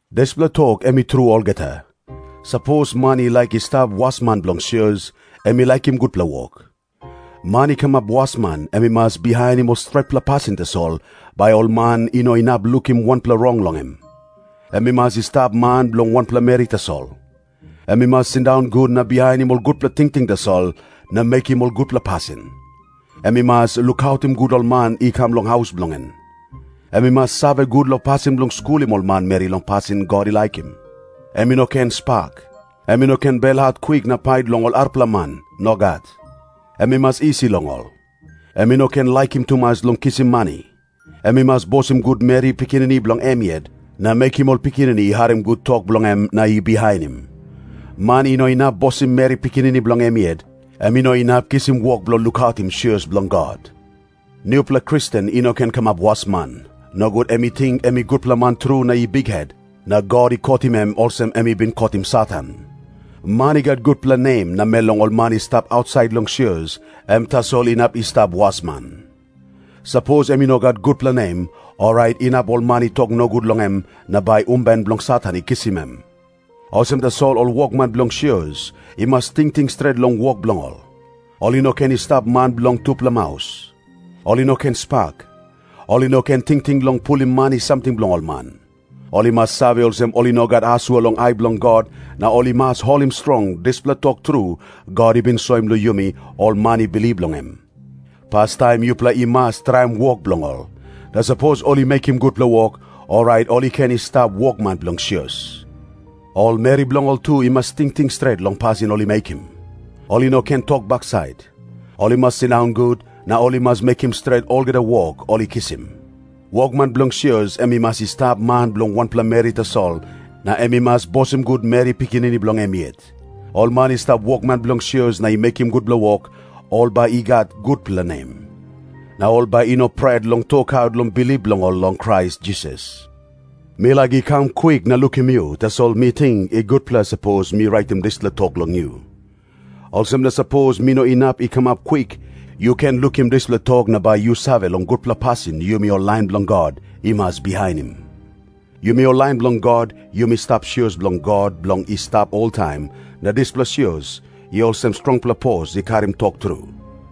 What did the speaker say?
Dispela tok em i tru olgeta. Sapos man i laik i stap wasman bilong sios, em i laikim gutpela wok. Man i kamap wasman em i mas bihainim ol stretpela pasin tasol, bai ol man i no inap lukim wanpela rong long em. Em i mas i stap man bilong wanpela meri tasol. Em i mas sindaun gut na bihainim ol gutpela tingting tasol na mekim ol gutpela pasin. Em i mas lukautim gut ol man i kam long haus bilong en. Em i mas save gut long pasin bilong skulim ol manmeri long pasin God i laikim. Em i no ken spak. Em i no ken belhat kwik na pait long ol arapela man. Nogat. Em i mas isi long ol. Em i no ken laikim tumas long kisim mani. Em i mas bosim gut meri pikinini bilong em yet, na mekim ol pikinini i harim gut tok bilong em na i bihainim. Man i no inap bosim meri pikinini bilong em yet, em i no inap kisim wok bilong lukautim sios bilong God. Nupela Kristen i no ken kamap wasman. Nogut em i ting em i gutpela man tru na i bikhet, na God i kotim em olsem em i bin kotim Satan. Man i gat gutpela nem namel long ol man i stap ausait long sios, em tasol inap i stap wasman. Sapos em i no gat gutpela nem, orait inap ol man i tok nogut long em na bai umben bilong Satan i kisim em. Olsem tasol ol wokman bilong sios i mas tingting stret long wok bilong ol. Ol i no ken i stap man bilong tupela maus. Ol i no ken spak. Ol i no ken tingting long pulim mani samting bilong ol man. Ol i mas save olsem ol i no gat asua long ai bilong God, na ol i mas holim strong dispela tok tru God i bin soim long yumi ol man i bilip long em. Pastaim yupela i mas traim wok bilong ol. Na sapos ol i mekim gutpela wok, orait ol i ken i stap wokman bilong sios. Ol meri bilong ol tu i mas tingting stret long pasin ol i mekim. Ol i no ken tok baksait. Ol i mas sindaun gut, na ol i mas mekim stret olgeta wok ol i kisim. Wokman bilong sios em i mas i stap man bilong wanpela meri tasol, na em i mas bosim gut meri pikinini bilong em yet. Ol man i stap wokman bilong sios na i mekim gutpela wok, ol bai i gat gutpela nem. Na ol bai i no pret long tokaut long bilip bilong ol long Krais Jisas. Mi laik i kam kwik na lukim yu, tasol mi ting i gutpela sapos mi raitim dispela tok long yu. Olsem na sapos mi no inap i kamap kwik, yu ken lukim dispela tok na bai yu save long gutpela pasin yumi ol lain bilong God i mas bihainim. Yumi ol lain bilong God, yumi stap sios bilong God bilong i stap oltaim, na dispela sios i olsem strongpela pos i karim tok tru.